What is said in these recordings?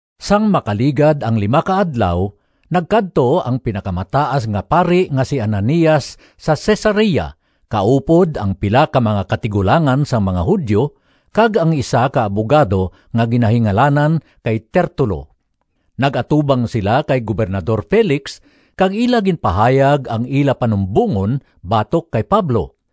Sang makaligad ang lima ka adlaw, nagkadto ang Pinakamataas nga Pari nga si Ananias sa Cesarea kaupod ang pila ka mga katigulangan sang mga Judio kag ang isa ka abugado nga ginahingalanan kay Tertulo. Nag-atubang sila kay Gobernador Felix kag ila ginpahayag ang ila panumbongon batok kay Pablo.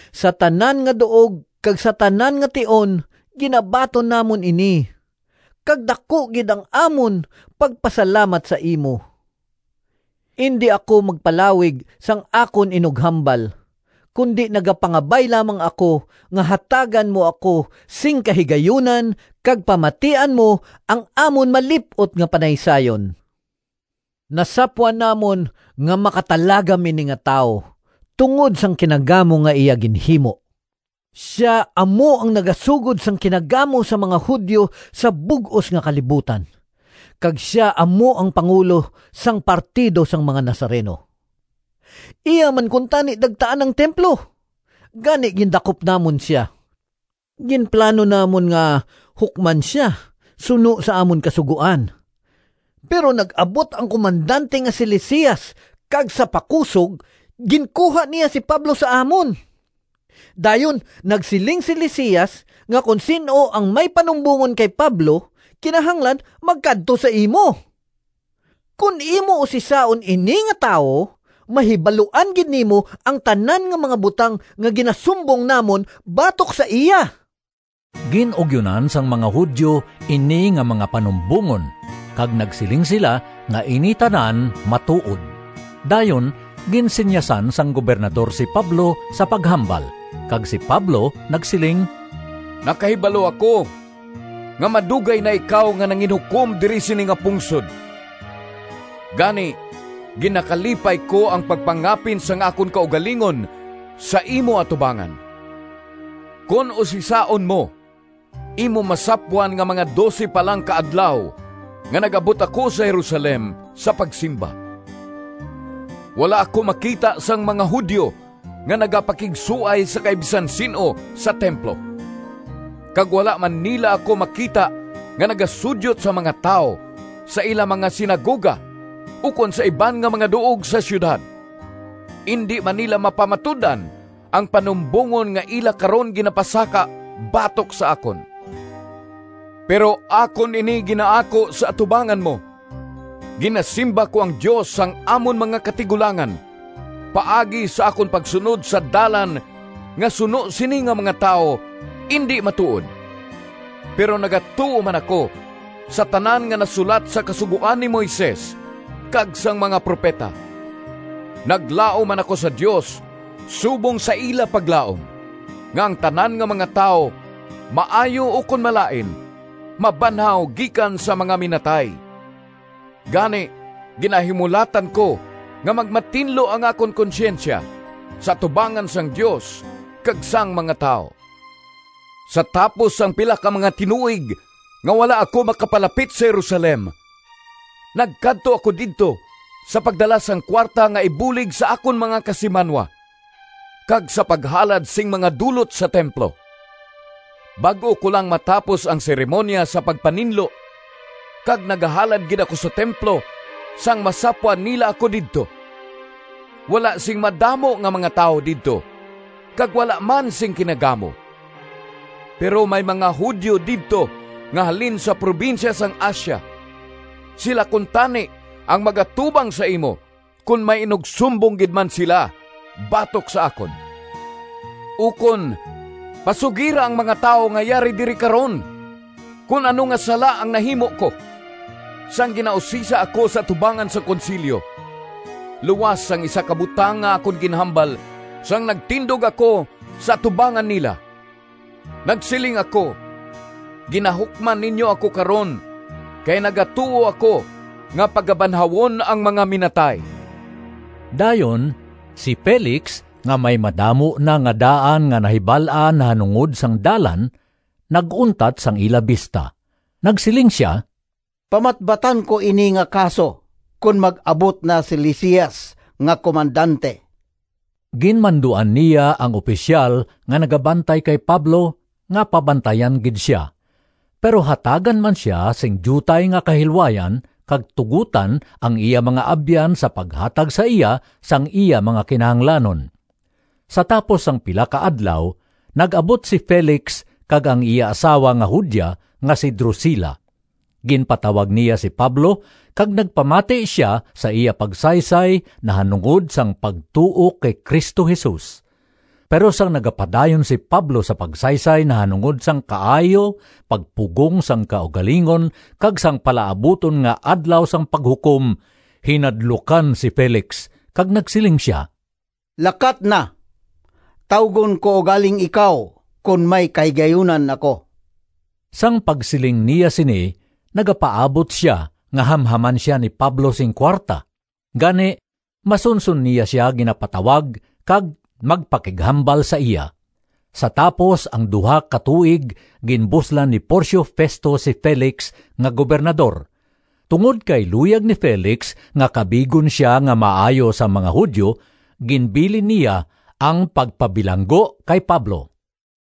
Sa tanan nga duog kag sa tanan nga tion ginabaton namon ini, kag daku gid ang amon pagpasalamat sa imo. Indi ako magpalawig sang akon inughambal, kundi nagapangabay lamang ako nga hatagan mo ako sing kahigayunan kag pamatian mo ang amon malip-ot nga panaysayon. Nasapwan namon nga makatalagam ini nga tawo tungod sang kinagamo nga iya ginhimo. Sia amo ang nagasugod sang kinagamo sa mga Judio sa bug-os nga kalibutan kag sia amo ang pangulo sang partido sang mga Nazareno. Iya man kuntani dagtaan ang templo, gani gindakop namon sia. [Ginplano namon nga hukman sia suno sa amon Kasugoan, pero nag-abot ang komandante nga si Lisias kag sa pakusog ginkuha niya si Pablo sa amon. Dayon nagsiling si Lisias nga kon sin-o ang may panumbongon kay Pablo, kinahanglan magkadto sa imo.] Kon imo usisaon ini nga tawo mahibaluan gid nimo ang tanan nga mga butang nga ginasumbong namon batok sa iya.” Gin-ugyonan sang mga Judio ini nga mga panumbongon kag nagsiling sila nga ini tanan matuod. Dayon ginsinyasan sang Gobernador si Pablo sa paghambal, kag si Pablo nagsiling: “Nakahibalo ako nga madugay na ikaw nga nanginhukom diri sini nga pungsod, gani ginakalipay ko ang pagpangapin sang akon kaugalingon sa imo atubangan. Kon usisaon mo, imo masapwan nga mga dose pa lang ka adlaw nga nag-abot ako sa Jerusalem sa pagsimba. Wala ako makita sang mga Judio nga nagapakigsuay sa kay bisan sin-o sa templo, kag wala man nila ako makita nga nagasudyot sa mga tawo sa ila mga sinagoga ukon sa iban nga mga duog sa siyudad. Indi man nila mapamatud-an ang panumbongon nga ila karon ginapasaka batok sa akon. Pero akon ini ginaako sa atubangan mo: Ginasimba ko ang Dios sang amon mga katigulangan paagi sa akon pagsunod sa Dalan nga suno sini nga mga tawo, indi matuod. Pero nagatuo man ako sa tanan nga nasulat sa Kasugoan ni Moises kag sang mga propeta. Naglaom man ako sa Dios subong sa ila paglaom nga ang tanan nga mga tawo, maayo ukon malain, mabanhaw gikan sa mga minatay. Gani ginahimulatan ko nga magmatinlo ang akon konsyensya sa atubangan sang Dios kag sang mga tawo. “Sa tapos ang pila ka mga tinuig nga wala ako makapalapit sa Jerusalem, nagkadto ako didto sa pagdala sang kuwarta nga ibulig sa akon mga kasimanwa, kag sa paghalad sing mga dulot sa templo. Bag-o ko lang matapos ang seremoniya sa pagpaninlo kag nagahalad gid ako sa templo sang masapwan nila ako didto. Wala sing madamo nga mga tawo didto; kag wala man sing kinagamo. Pero may mga Judio didto nga halin sa probinsya sang Asia. Sila kuntani ang mag-atubang sa imo kon may inugsumbong gid man sila batok sa akon. Ukon pasugira ang mga tawo nga yari diri karon kon ano nga sala ang nahimo ko, sang ginausisa ako sa atubangan sang Konsilyo, luas sang isa ka butang nga akon ginhambal sang nagtindog ako sa atubangan nila. Nagsiling ako, ‘Ginahukman ninyo ako karon, kay nagatuo ako nga pagabanhawon ang mga minatay.’” Dayon si Felix nga may madamo na nga daan nga nahibal-an nahanungod sang Dalan, nag-untat sang ila bista. Nagsiling sia, “Pamatbatan ko ini nga kaso kon mag-abot na si Lisias nga komandante.” Ginmanduan niya ang opisyal nga nagabantay kay Pablo nga pabantayan gid sia, pero hatagan man sia sing diutay nga kahilwayan kag tugotan ang iya mga abyan sa paghatag sa iya sang iya mga kinahanglanon. Sa tapos ang pila ka adlaw, nag-abot si Felix kag ang iya asawa nga Judia nga si Drusila. Ginpatawag niya si Pablo kag nagpamati sia, sa iya pagsaysay nahanungod sang pagtuo kay Cristo Jesus. Pero sang nagapadayon si Pablo sa pagsaysay nahanungod sang kaayo, pagpugong sang kaugalingon, kag sang palaabuton nga Adlaw sang Paghukom, hinadlukan si Felix kag nagsiling sia, “Lakat na! Tawgon ko ugaling ikaw kon may kahigayunan ako.” Sang pagsiling niya sini nagapaabot sia nga hamhaman sia ni Pablo sing kuwarta, gani, masunson niya sia ginapatawag kag magpakighambal sa iya. Sa tapos ang duha ka tuig ginbuslan ni Porcio Festo si Felix nga gobernador. Tungod kay luyag ni Felix nga kabigon sia nga maayo sang mga Judio ginbilin niya ang pagpabilanggo kay Pablo.